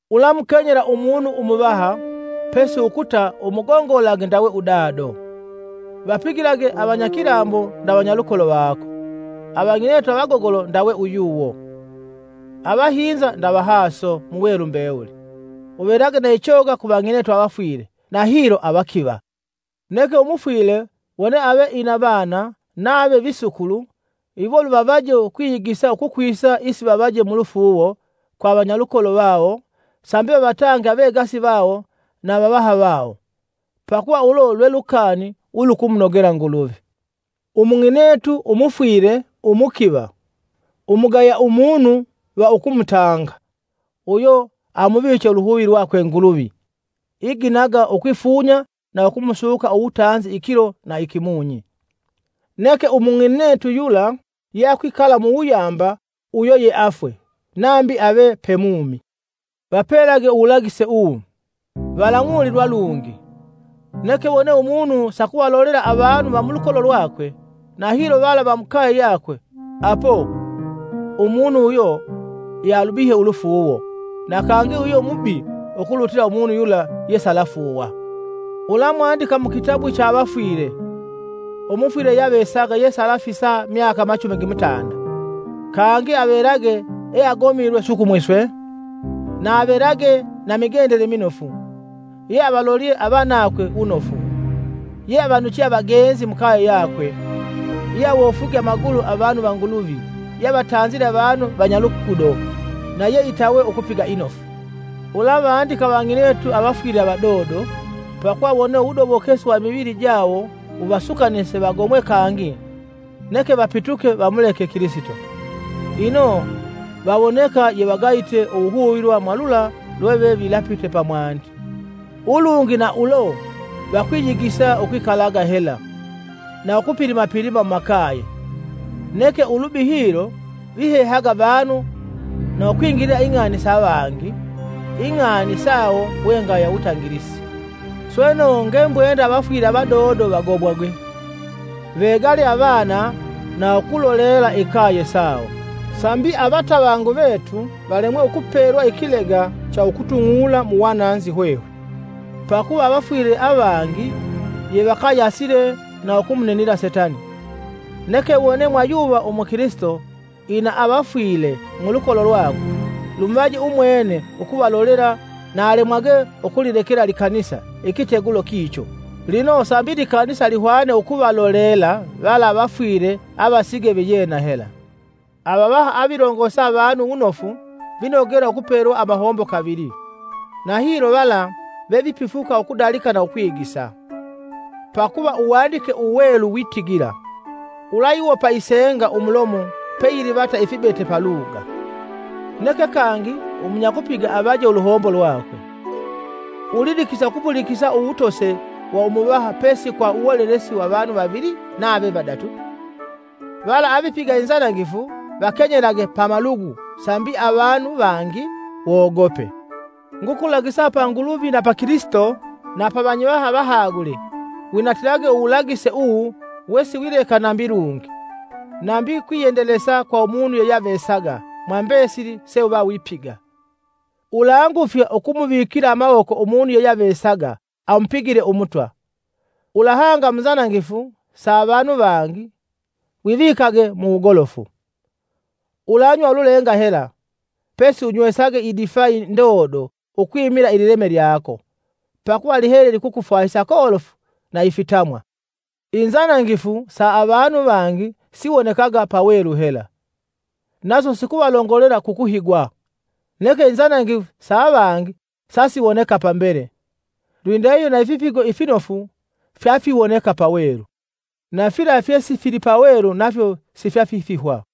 Ulamukenyela umunu umuvaha, pesi ukuta umugongolage ndawe udado. Vapigilage avanyakilambo nda vanyalukolo vako; avang'inetu avagogolo ndawe uyuwo; avahinza nda vahaso, muwelu mbewuli. Uvelage na ichoga ku vang'inetu avafwile na hilo avakiva. Neke umufwile wone ave ina vana nave visukulu, iwo luvavaje ukwiyigisa ukukwisa isivavaje mulufuuwo kwa avanyalukolo vawo sambi vavatange avegasi vawo na avavaha vawo, pakuva ulo lwe lukani ulukumunogela Nguluvi. Umung'inetu umufwile umukiva, umugaya umunu va ukumutanga, uyo amuviche uluhuvi lwakwe Nguluvi iginaga ukwifunya na ukumusuka uwutanzi ikilo na ikimunyi. Neke Umung'inetu yula yeakwikala muwuyamba uyo yeafwe, nambi ave pemumi. Vapelage uwulagise uwu, valang'ulilwa lungi. Neke wone umunu sakuvalolela avanu va mulukolo lwakwe, na hilo vala va mukaye yakwe, apo. Umunu uyo yealubihye ulufuuwo, na kangi uyo mubi ukulutila umunu yula yesialafuuwa. Ulamwandikia mu kitabu cha avafwile, umufwile yeyeavesaga yesalafisa myaka machumi gimutanda, kangi avelage eagomilwe sukumwi swe, na avelage na migendele minofu, yeavalolye avanakwe wunofu; yeavanuche avagenzi mukaye yakwe, yeawofwige amagulu avanu va Nguluvi yeavatanzile avanu vanyalugudo, na yeitawe ukupiga inofu, Ulavandika avang'inetu avafwile avadodo, pakuva wone uwudobokesi wa imivili jawo wuvasukanise vagomwe kangi neke vapituke vamuleke Kilisito, Ino vawoneka yevagayite uwuhuvilwa mwa lula lwevevilapite pamwandi. Ulungi na ulo vakwiyigisa ukwikalaga hela, na ukupilimapilima mumakaye, neke ulubi hilo vihehaga vanu na ukwingilila ing'ani sa vangi, ing'ani sawo we ngaya wutangilisi. Sweno ngembwenda avafwile avadodo vagomwage, vegale avana na ukulolela ikaye sawo sambi avatavangu vetu valemwe ukupelwa ikilega cha ukutung'ula mu wananzi hwehwe. Pakuva avafwile avangi yevakayasile na ukumuminila setani. Neke wone mwayuva umukilisito ina avafwile mulukolo lwakwe, lumuvaje umwene ukuvalolela na alemwage ukulilekela likanisa ikitegulo kicho, lino sambi likanisa lihwane ukuvalolela vala avafwile avasige viyena hela. Avavaha avilongosa avanu wunofu vinogela ukupelwa amahombo kavili, na hilo vala vevipifuka ukudalika na ukwigisa. Pakuva Uwandike Uwelu witigila: “Ulayiwopa isenga umulomo peyilivata ifibete paluga.” “Neke kangi umunyakupiga anoje uluhombo lwakwe.” Ulidikila ukupulikisa uwutose wa umuvaha pesi kwa uwolelesi wa vanu vavili nave vadatu. Vala avipiga inzanangifu vakenyelage pamalugu sambi avanu vangi wogope, Ngukulagisa pa Nguluvi na pa Kilisito na pa vanyivaha avahagule winatilage uwulagise uwu wesiwileka nambi lungi, nambi kwiyendelesa kwa umunu yeyeavesaga mwambesili se uva wipiga. Ulangufya ukumuvikila amawoko umunu yeyeavesaga amupigile Umutwa. Ulahanga mu nzanangifu sa avanu vangi wivikage mu wugolofu. Ulanywa ululenga hela, pesi unywesage idifai ndondo ukwimila ilileme lyako, pakuva lihele likukufwahisa kolofu na ifitamwa. Inzanangifu sa avanu vangi siwonekaga pawelu hela, naso sikuvalongolela kukuhigwa, neke inzanangifu sa avangi sasiwoneka pambele. Lwindahihyo na ifipigo ifinofu fyafiwoneka pawelu, na fila fyesifili pawelu nafyo sifyafifihwa.